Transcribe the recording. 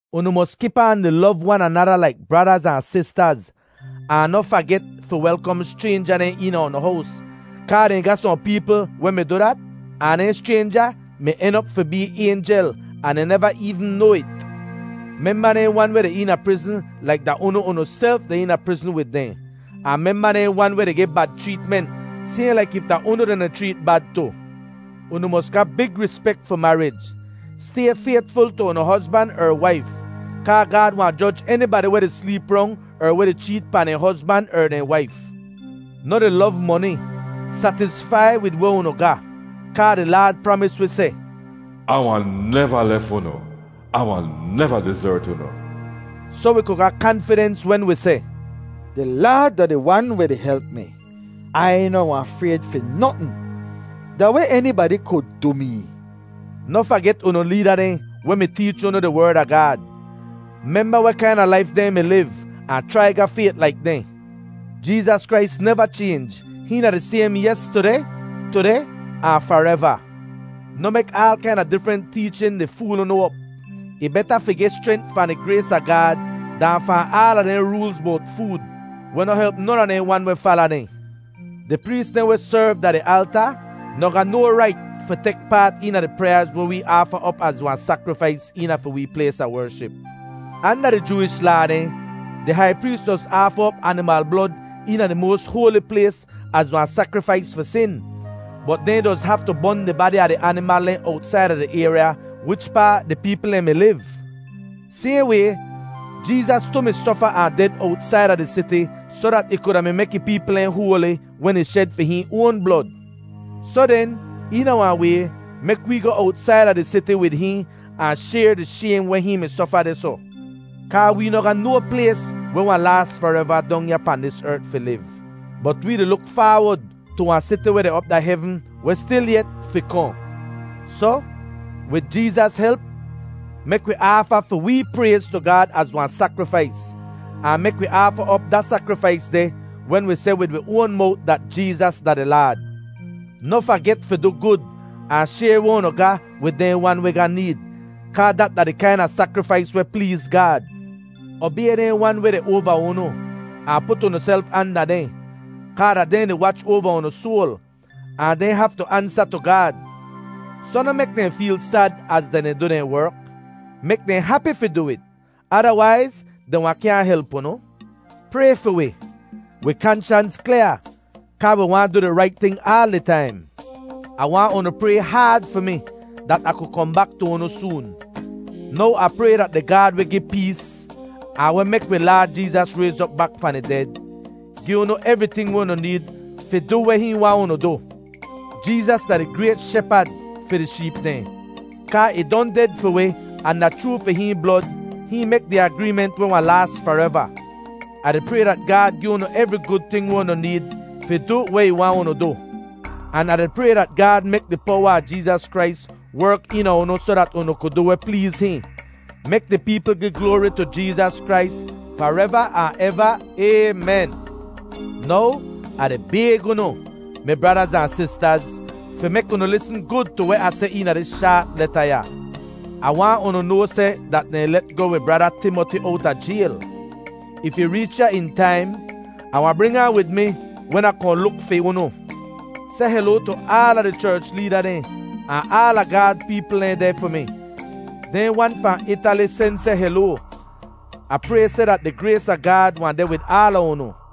Unu mos kip aan di lov wan anada laik bradaz ahn sistaz. Ahn noh faget fi welkom schraynja dehn eena unu hows, kaa dehn ga sohn peepl weh mi du dat, ahn dehn schraynja mi en op fi bee aynjel ahn dehn neva eevn noa it. Memba dehn wan weh deh eena prizn laik da unu unuself deh eena prizn wid dehn, ahn memba dehn wan weh di geh bad chreetment, sayhn laik if da unu dehn di chreet bad tu. Unu mos ga big rispek fi marij. Stay faytful tu unu hozban er waif, kaa Gaad wahn joj enibadi weh di sleep rong er weh di cheet pahn dehn hozban er dehn waif. Noh di lov moni; satisfai wid weh unu ga, kaa di Laad pramis wi seh, “Ah wahn neva lef unu; Ah wahn neva dizert unu.” Soh wi ku ga kanfidens wen wi seh, “Di Laad da di Wan weh di help mi; Ai noh wahn frayd fi notn. Da weh enibadi ku du mee?” Noh faget unu leeda dehn weh mi teech unu di Werd a Gaad. Memba weh kaina laif dehn mi liv, ahn chrai ga fayt laik dehn. Jeezas Krais neva chaynj; hihn da di saym yestudeh, tudeh, ahn fareva. Noh mek aal kaina difrent teechin di fool unu op. Ih beta fi geh schrent fahn di grays a Gaad dahn fahn aala dehn roolz bowt food, weh noh help non a dehn wan weh fala dehn. Di prees dehn weh serv da di alta noh ga no rait fi tek paat eena di pryaaz weh wee aafa op az wahn sakrifais eena fi wee plays a wership. Anda di Jooish Laa dehn, di hai prees doz aafa op animal blod eena Di Moas Hoali Plays az wahn sakrifais fi sin, bot dehn doz bon di badi a di animal dehn owtsaida di ayrya wichpaa di peepl dehn mi liv. Sayhn way, Jeezas tu mi sofa ahn ded owtsaida di siti soh dat ih kuda mi mek ih peepl dehn hoali wen ih shed fi hihn oan blod. Soh den, eena wahn way, mek wee goh owtsaida di siti wid hihn ahn shayr di shaym weh hihn mi sofa dehsoh. Kaa wee noh ga no plays weh wahn laas fareva dong ya pahn dis ert fi liv, bot wee di luk faawod tu wahn siti weh deh op da hevn weh stilyet fi kohn. Soh, wid Jeezas help, mek wi aafa fi wee prayz tu Gaad az wahn sakrifais, ahn mek wi aafa op da sakrifais deh wen wi seh wid wi oan mowt dat Jeezas da di Laad. Noh faget fi du gud ahn shayr weh unu ga wid dehn wan weh ga need, kaa dat da di kaina sakrifais weh pleez Gaad. Obay dehn wan weh deh oava unu, ahn put unuself anda dehn, kaa da dehn di wach oava unu soal, ahn dehn haftu ansa tu Gaad. Soh noh mek dehn feel sad az dehn di du dehn werk. Mek dehn hapi fi du it; adawaiz dehn wahn kyaahn help unu. Pray fi wi. Wi kanshans klyaa kaa wi waahn du di rait ting aal di taim. Ah waahn unu pray haad fi mi dat Ah ku kohn bak tu unu soon. Now Ah pray dat di Gaad weh gi pees, ahn weh mek wi Laad Jeezas rayz op bak fahn di ded, gi unu evriting weh unu need fi du weh hihn waahn unu du. Jeezas da di grayt Shepad fi di sheep dehn, kaa ih don ded fi wi ahn da chroo fi hihn blod, hihn mek di agreement weh wahn laas fareva. Ah di pray dat Gaad gi unu evri gud ting weh unu need fi du weh ih waahn unu du. An Ah di pray dat Gaad mek di powa a Jeezas Krais werk eena unu soh dat unu ku du weh pleez hihn. Mek di peepl gi gloari tu Jeezas Krais fareva ahn eva! Aymen. Now, Ah di bayg unu, mi bradaz ahn sistaz, fi mek unu lisn gud tu weh Ah seh eena dis shaat leta ya. Ah waahn unu noa seh dat dehn let goh wi brada Timoti owta jayl. If ih reech ya in taim, Ah wahn bring ahn wid mi wen Ah kohn luk fi unu. Seh heloa tu aala di cherch leeda dehn ahn aala Gaad peepl dehn deh fi mi. Dehn wan fahn Itali sen seh heloa. Ah pray seh dat di grays a Gaad wahn deh wid aala unu.